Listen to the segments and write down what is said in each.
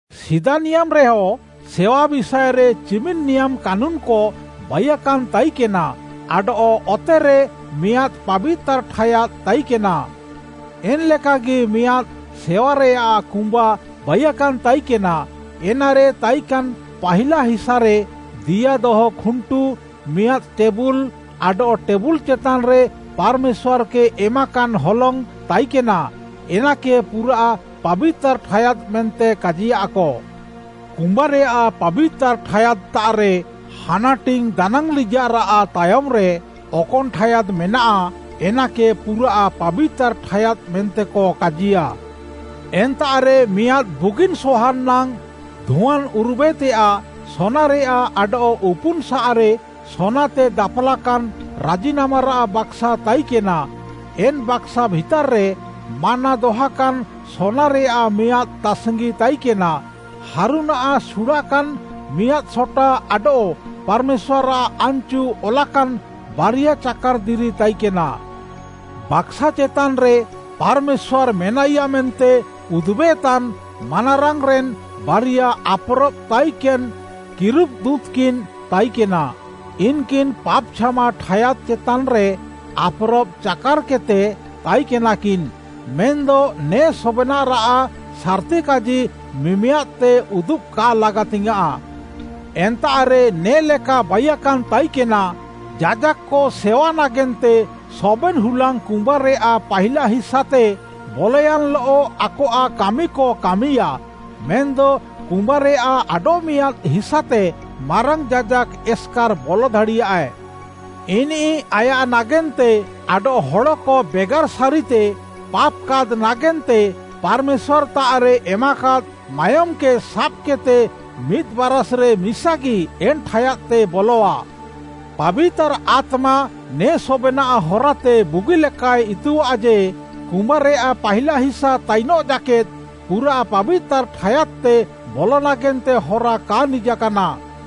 ସିଦା ନିୟାମ୍‌ରେୟ ସେୱା ବିଷାଏରେ ଚିମିନ୍‌ ନିୟାମ୍‌ କାନୁନ୍‌କ ବାଇୟାକାନ୍‌ ତାଇକେନା ଆଡଃ ଅତେରେ ମିଆଁଦ୍‌ ପାବିତାର୍‌ ଠାୟାଦ୍‌ ତାଇକେନା। ଏନ୍‌ଲେକାଗି ମିଆଁଦ୍‌ ସେୱାରେୟାଃ କୁମ୍ବା ବାଇୟାକାନ୍‌ ତାଇକେନା। ଏନାରେ ତାଇକାନ୍‌ ପାହିଲା ହିସାରେ ଦିଆ ଦହ ଖୁଣ୍ଟୁ, ମିଆଁଦ୍‌ ଟେବୁଲ୍‌ ଆଡଃ ଟେବୁଲ୍‌ ଚେତାନ୍‌ରେ ପାର୍‌ମେଶ୍ୱାର୍‌କେ ଏମାକାନ୍‌ ହଲଙ୍ଗ୍‌ ତାଇକେନା। ଏନାକେ ପୁରାଃ ପାବିତାର୍‌ ଠାୟାଦ୍‌ ମେନ୍ତେ କାଜିୟାଃକ। କୁମ୍ବାରେୟାଃ ପାବିତାର୍‌ ଠାୟାଦ୍‌ତାଃରେ ହାନାଟିଙ୍ଗ୍‌ ଦାନାଙ୍ଗ୍‌ଲିଜାଃରାଃ ତାୟମ୍‌ରେ ଅକନ୍‌ ଠାୟାଦ୍‌ ମେନାଃ, ଏନାକେ ପୁରାଃ ପାବିତାର୍‌ ଠାୟାଦ୍‌ ମେନ୍ତେକ କାଜିୟାଃ। ଏନ୍ତାଃରେ ମିଆଁଦ୍‌ ବୁଗିନ୍‌ ସହାନ୍‌ ନାଙ୍ଗ୍‌ ଧୁଆନ୍‌ ଉରୁବେତେୟାଃ ସୋନାରେୟାଃ ଆଡଃ ଉପୁନ୍‌ସାଃରେ ସୋନାତେ ଦାପାଲାକାନ୍‌ “ରାଜିନାମାରାଃ ବାକ୍‌ସା” ତାଇକେନା। ଏନ୍‌ ବାକ୍‌ସା ଭିତାର୍‌ରେ “ମାନ୍ନା” ଦହାକାନ୍‌ ସୋନାରେୟାଃ ମିଆଁଦ୍‌ ତାସ୍‌ଙ୍ଗି ତାଇକେନା, ହାରୁନ୍‌ଆଃ ସୁଡ଼ାକାନ୍‌ ମିଆଁଦ୍‌ ସଟା ଆଡଃ ପାର୍‌ମେଶ୍ୱାର୍‌ଆଃ ଆନ୍‌ଚୁ ଅଲାକାନ୍‌ ବାରିଆ ଚାକାର୍‌ ଦିରି ତାଇକେନା। ବାକ୍‌ସା ଚେତାନ୍‌ରେ ପାର୍‌ମେଶ୍ୱାର୍‌ ମେନାଇୟା ମେନ୍ତେ ଉଦୁବେତାନ୍‌ ମାନାରାଙ୍ଗ୍‌ରେନ୍‌ ବାରିଆ ଆପ୍‌ରବ୍‌ ତାଇକେନ୍‌ କିରୁବ୍‌ଦୁଁତ୍‌କିନ୍‌ ତାଇକେନା। ଇନ୍‌କିନ୍‌ ପାପ୍‌ ଛାମା ଠାୟାଦ୍‌ ଚେତାନ୍‌ରେ ଆପ୍‌ରବ୍‌ ଚାକାର୍‌କେଦ୍‌ତେ ତାଇକେନାକିନ୍‌, ମେନ୍‌ଦ ନେ ସବେନାଃରାଃ ସାର୍‌ତିକାଜି ମିମିଆଦ୍‌ତେ ଉଦୁବ୍‌ କା ଲାଗାତିଙ୍ଗ୍‌ୟାଁଃ। ଏନ୍ତାଃରେ ନେ'ଲେକା ବାଇକାନ୍‌ ତାଇକେନା, ଯାଜାକ୍‌କ ସେୱା ନାଗେନ୍ତେ ସବେନ୍‌ ହୁଲାଙ୍ଗ୍‌ କୁମ୍ବାରେୟାଃ ପାହିଲା ହିସାତେ ବଲୟାନ୍‌ଲଃ ଆକଆଃ କାମିକ କାମିୟାଃ, ମେନ୍‌ଦ କୁମ୍ବାରେୟାଃ ଆଡଃମିଆଁଦ୍‌ ହିସାତେ ମାରାଙ୍ଗ୍‌ ଯାଜାକ୍‌ ଏସ୍‌କାର୍‌ ବଲ ଦାଡ଼ିୟାଏ। ଇନିଃ ଆୟାଃ ନାଗେନ୍ତେ ଆଡଃ ହଡ଼କ ବେଗାର୍‌ ସାରିତେ ପାପ୍‌କାଦ୍‌ ନାଗେନ୍ତେ, ପାର୍‌ମେଶ୍ୱାର୍‌ତାଃରେ ଏମାକାଦ୍‌ ମାୟୋମ୍‌କେ ସାବ୍‌କେଦ୍‌ତେ ମିଦ୍‌ ବାରାଷ୍‌ରେ ମିସାଗି ଏନ୍‌ ଠାୟାଦ୍‌ତେ ବଲଆ। ପାବିତାର୍‌ ଆତ୍ମା ନେ ସବେନାଃ ହରାତେ ବୁଗିଲେକାଏ ଇତୁଆଃ ଯେ, କୁମ୍ବାରେୟାଃ ପାହିଲା ହିସା ତାଇନଃ ଜାକେଦ୍‌, ପୁରାଃ ପାବିତାର୍‌ ଠାୟାଦ୍‌ତେ ବଲ ନାଗେନ୍ତେ ହରା କା ନିଜାକାନା।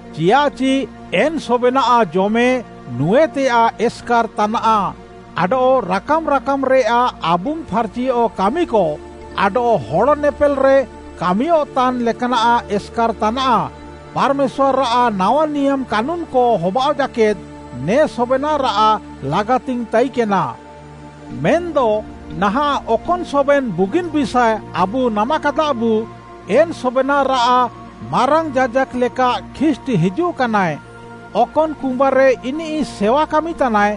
ଚିୟାଃଚି ଏନ୍‌ ସବେନାଃ ଜମେ, ନୁଁଏତେୟାଃ ଏସ୍‌କାର୍‌ ତାନାଃ ଆଡଃ ରାକାମ୍‌ ରାକାମ୍‌ରେୟାଃ ଆବୁଙ୍ଗ୍‌ ଫାର୍‌ଚିୟଃ କାମିକ ଆଡଃ ହଡ଼ ନେପେଲ୍‌ରେ କାମିୟଃତାନ୍‌ ଲେକାନାଃ ଏସ୍‌କାର୍‌ ତାନାଃ। ପାର୍‌ମେଶ୍ୱାର୍‌ଆଃ ନାୱା ନିୟାମ୍‌ କାନୁନ୍‌କ ହବାଅଃ ଜାକେଦ୍‌ ନେ ସବେନାଃରାଃ ଲାଗାତିଙ୍ଗ୍‌ ତାଇକେନା। ମେନ୍‌ଦ ନାହାଁଃ ଅକନ୍‌ ସବେନ୍‌ ବୁଗିନ୍‌ ବିଷାଏ ଆବୁ ନାମାକାଦାବୁ, ଏନ୍‌ ସବେନାଃରାଃ ମାରାଙ୍ଗ୍‌ ଯାଜାକ୍‌ ଲେକା ଖ୍ରୀଷ୍ଟ୍‌ ହିଜୁଃକାନାଏ। ଅକନ୍‌ କୁମ୍ବାରେ ଇନିଃ ସେୱା କାମିତାନାଏ,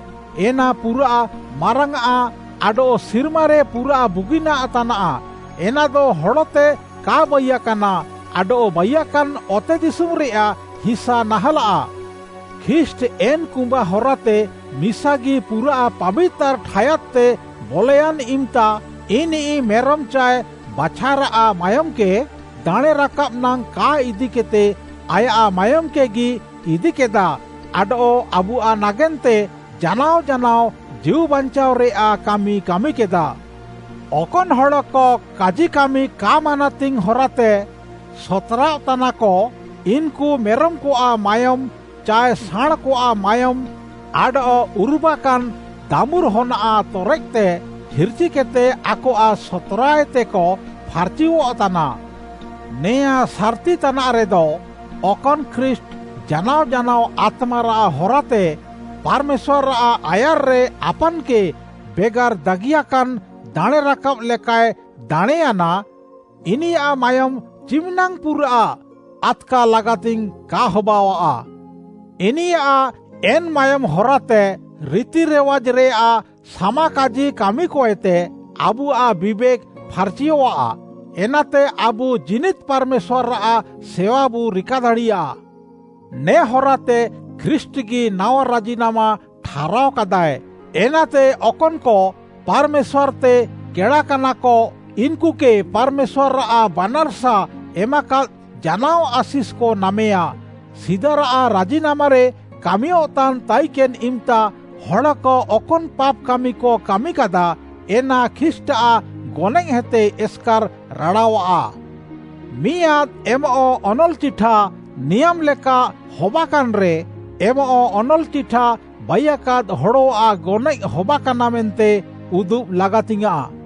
ଏନା ପୁରାଃ ମାରାଙ୍ଗ୍‌ଆଁ ଆଡଃ ସିର୍ମାରେ ପୁରାଃ ବୁଗିନାଃ ତାନାଃ। ଏନାଦ ହଡ଼ତେ କା ବାଇୟାକାନା, ଆଡଃ ବାଇୟାକାନ୍‌ ଅତେଦିଶୁମ୍‌ରେୟାଃ ହିସା ନାହାଁଲାଃ। ଖ୍ରୀଷ୍ଟ୍‌ ଏନ୍‌ କୁମ୍ବା ହରାତେ ମିସାଗି ପୁରାଃ ପାବିତାର୍‌ ଠାୟାଦ୍‌ତେ ବଲୟାନ୍‌ ଇମ୍‌ତା ଇନିଃ ମେରମ୍‌ ଚାଏ ବାଛାରାଃ ମାୟୋମ୍‌କେ ଦାଣେଁ ରାକାବ୍‌ ନାଙ୍ଗ୍‌ କା ଇଦିକେଦ୍‌ତେ ଆୟାଃ ମାୟୋମ୍‌କେଗି ଇଦିକେଦା ଆଡଃ ଆବୁଆଃ ନାଗେନ୍ତେ ଜାନାଅ ଜାନାଅ ଜୀଉ ବାଞ୍ଚାଅରେୟାଃ କାମି କାମିକେଦା। ଅକନ୍‌ ହଡ଼କ କାଜିକାମି କା ମାନାତିଙ୍ଗ୍‌ ହରାତେ ସତ୍‌ରାଅଃତାନାକ, ଇନ୍‌କୁ ମେରମ୍‌କଆଃ ମାୟୋମ୍‌ ଚାଏ ସାଁଣ୍‌କଆଃ ମାୟୋମ୍‌ ଆଡଃ ଉରୁବାକାନ୍‌ ଦାମୁର୍‌ହନ୍‌ଆଃ ତରେକ୍‌ତେ ହିର୍‌ଚିକେଦ୍‌ତେ ଆକଆଃ ସତ୍‌ରାଏତେକ ଫାର୍‌ଚିୟଃତାନା। ନେଆଁଁ ସାର୍‌ତି ତାନାଃରେଦ, ଅକନ୍‌ ଖ୍ରୀଷ୍ଟ୍‌ ଜାନାଅ ଜାନାଅ ଆତ୍ମାରାଃ ହରାତେ ପାର୍‌ମେଶ୍ୱାର୍‌ଆଃ ଆୟାର୍‌ରେ ଆପାନ୍‌କେ ବେଗାର୍‌ ଦାଗିୟାକାନ୍‌ ଦାଣେଁରାକାବ୍‌ ଲେକାଏ ଦାଣେଁୟାନା। ଇନିୟାଃ ମାୟୋମ୍‌ ଚିମିନାଙ୍ଗ୍‌ ପୁରାଃ ଆଦ୍‌କା ଲାଗାତିଙ୍ଗ୍‌ କା ହବାଅଃଆ? ଇନିୟାଃ ଏନ୍‌ ମାୟୋମ୍‌ ହରାତେ ରିତିରିୱାଜ୍‌ରେୟାଃ ସାମାକାଜି କାମିକଏତେ ଆବୁଆଃ ବିବେକ୍‌ ଫାର୍‌ଚିୟଃଆ, ଏନାତେ ଆବୁ ଜୀନିଦ୍‌ ପାର୍‌ମେଶ୍ୱାର୍‌ଆଃ ସେୱାବୁ ରିକାଦାଡ଼ିୟା। ନେ ହରାତେ ଖ୍ରୀଷ୍ଟ୍‌ଗି ନାୱା ରାଜିନାମା ଠାହାରାଅକାଦାଏ, ଏନାତେ ଅକନ୍‌କ ପାର୍‌ମେଶ୍ୱାର୍‌ତେ କେଡ଼ାକାନାକ, ଇନ୍‌କୁକେ ପାର୍‌ମେଶ୍ୱାର୍‌ଆଃ ବାନାର୍‌ସା ଏମାକାଦ୍‌ ଜାନାଅ ଆଶିଷ୍‌କ ନାମେୟାଁ। ସିଦାରାଃ ରାଜିନାମାରେ କାମିୟଃତାନ୍‌ ତାଇକେନ୍‌ ଇମ୍‌ତା, ହଡ଼କ ଅକନ୍‌ ପାପ୍‌କାମିକ କାମିକାଦା, ଏନା ଖ୍ରୀଷ୍ଟ୍‌ଆଃ ଗନଏଃହେତେ ଏସ୍‌କାର୍‌ ରାଡ଼ାଅଃଆ। ମିଆଁଦ୍‌ ଏମଃ ଅନଲ୍‌ଚିଠା ନିୟାମ୍‌ ଲେକା ହବାକାନ୍‌ରେ, ଏମଃ ଅନଲ୍‌ଚିଠା ବାଇୟାକାଦ୍‌ ହଡ଼ଆଃ ଗନଏଃ ହବାକାନା ମେନ୍ତେ ଉଦୁବ୍‌ ଲାଗାତିଙ୍ଗ୍‌ୟାଁଃ।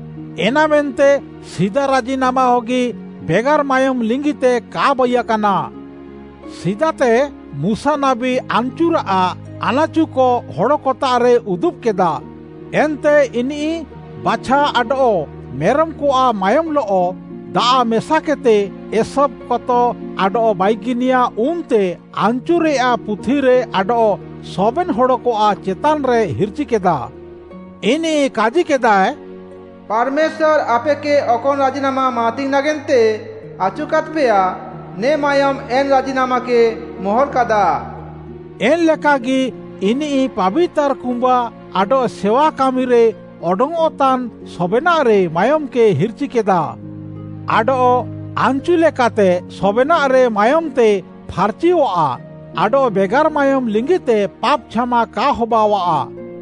ଏନାମେନ୍ତେ ସିଦା ରାଜିନାମା ହଗି ବେଗାର୍‌ ମାୟୋମ୍‌ ଲିଙ୍ଗିତେ କା ବାଇୟାକାନା। ସିଦାତେ ମୁଶା ନାବୀ ଆନ୍‌ଚୁରାଃ ଆନାଚୁକ ହଡ଼କତାଃରେ ଉଦୁବ୍‌କେଦା। ଏନ୍ତେ ଇନିଃ ବାଛା ଆଡଃ ମେରମ୍‌କଆଃ ମାୟୋମ୍‌ଲଃ ଦାଆଃ ମେସାକେଦ୍‌ତେ, ଏସୋବ୍‌ କତ ଆଡଃ ବାଇଗିନିଆ ଉନ୍‌ତେ ଆନ୍‌ଚୁରେୟାଃ ପୁଥିରେ ଆଡଃ ସବେନ୍‌ ହଡ଼କଆଃ ଚେତାନ୍‌ରେ ହିର୍‌ଚିକେଦା। ଇନିଃ କାଜିକେଦାଏ, “ପାର୍‌ମେଶ୍ୱାର୍‌ ଆପେକେ ଅକନ୍‌ ରାଜିନାମା ମାନାତିଙ୍ଗ୍‌ ନାଗେନ୍ତେ ଆଚୁକାଦ୍‌ପେୟା, ନେ ମାୟୋମ୍‌ ଏନ୍‌ ରାଜିନାମାକେ ମୋହର୍‌ କାଦା।” ଏନ୍‌ଲେକାଗି ଇନିଃ ପାବିତାର୍‌ କୁମ୍ବା ଆଡଃ ସେୱା କାମିରେ ଅଡଙ୍ଗ୍‌ଅଃତାନ୍‌ ସବେନାଃରେ ମାୟୋମ୍‌କେ ହିର୍‌ଚିକେଦା। ଆଡଃ ଆନ୍‌ଚୁ ଲେକାତେ ସବେନାଃରେ ମାୟୋମ୍‌ତେ ଫାର୍‌ଚିୟଃଆ, ଆଡଃ ବେଗାର୍‌ ମାୟୋମ୍‌ ଲିଙ୍ଗିତେ ପାପ୍‌ ଛାମା କା ହବାଅଃଆ।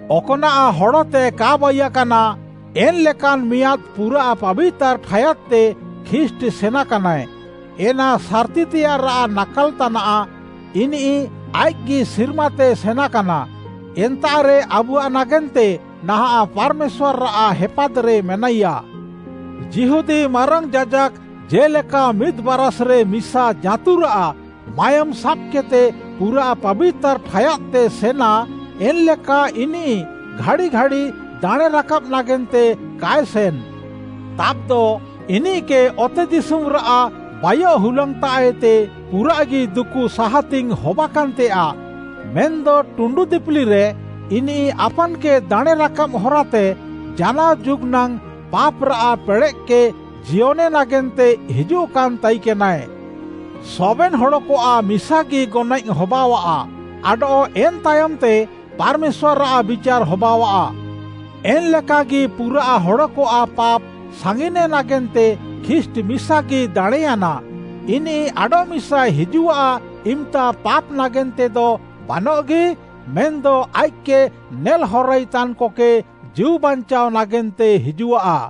ଅକ୍‌ନାଃ ହଡ଼ତେ କା ବାଇୟାକାନା, ଏନ୍‌ଲେକାନ୍‌ ମିଆଁଦ୍‌ ପୁରାଃ ପାବିତାର୍‌ ଠାୟାଦ୍‌ତେ ଖ୍ରୀଷ୍ଟ୍‌ ସେନାକାନାଏ। ଏନା ସାର୍‌ତିତେୟାଃରାଃ ନାକାଲ୍‌ ତାନାଃ। ଇନିଃ ଆଇଃକ୍‌ଗି ସିର୍ମାତେ ସେନାକାନା, ଏନ୍ତାଃରେ ଆବୁଆଃ ନାଗେନ୍ତେ ନାହାଁଃ ପାର୍‌ମେଶ୍ୱାର୍‌ଆଃ ହେପାଦ୍‌ରେ ମେନାଇୟା। ଯିହୁଦୀ ମାରାଙ୍ଗ୍‌ ଯାଜାକ୍‌ ଜେ'ଲେକା ମିଦ୍‌ ବାରାଷ୍‌ରେ ମିସା ଜାଁତୁରାଃ ମାୟୋମ୍‌ ସାବ୍‌କେଦ୍‌ତେ ପୁରାଃ ପାବିତାର୍‌ ଠାୟାଦ୍‌ତେ ସେନା, ଏନ୍‌ଲେକା ଇନିଃ ଘାଡ଼ିଘାଡ଼ି ଦାଣେଁ ରାକାବ୍‌ ନାଗେନ୍ତେ କାଏ ସେନ୍‌। ତାବ୍‌ଦ ଇନିଃକେ ଅତେଦିଶୁମ୍‌ରାଃ ବାଇୟଃ ହୁଲାଙ୍ଗ୍‌ତାଃଏତେ ପୁରାଃଗି ଦୁକୁ ସାହାତିଙ୍ଗ୍‌ ହବାକାନ୍‌ତେୟାଃ। ମେନ୍‌ଦ ଟୁଣ୍ଡୁ ଦିପିଲିରେ ଇନିଃ ଆପାନ୍‌କେ ଦାଣେଁ ରାକାବ୍‌ ହରାତେ ଜାନାଅ ଯୁଗ୍‌ ନାଙ୍ଗ୍‌ ପାପ୍‌ରାଃ ପେଡ଼େଃକେ ଜିୟନେ ନାଗେନ୍ତେ ହିଜୁଃକାନ୍‌ ତାଇକେନାଏ। ସବେନ୍‌ ହଡ଼କଆଃ ମିସାଗି ଗନଏଃ ହବାଅଃଆ ଆଡଃ ଏନ୍‌ ତାୟମ୍‌ତେ ପାର୍‌ମେଶ୍ୱାର୍‌ଆଃ ବିଚାର୍‌ ହବାଅଃଆ। ଏନ୍‌ଲେକାଗି ପୁରାଃ ହଡ଼କଆଃ ପାପ୍‌ ସାଙ୍ଗିନେ ନାଗେନ୍ତେ ଖ୍ରୀଷ୍ଟ୍‌ ମିସାଗି ଦାଣେଁୟାନା। ଇନିଃ ଆଡଃମିସାଏ ହିଜୁଃଆ, ଇମ୍‌ତା ପାପ୍‌ ନାଗେନ୍ତେଦ ବାନଃଗି, ମେନ୍‌ଦ ଆଇଃକ୍‌କେ ନେଲ୍‌ହରାଇ ତାନ୍‌କକେ ଜୀଉବାଞ୍ଚାଅ ନାଗେନ୍ତେ ହିଜୁଃଆ।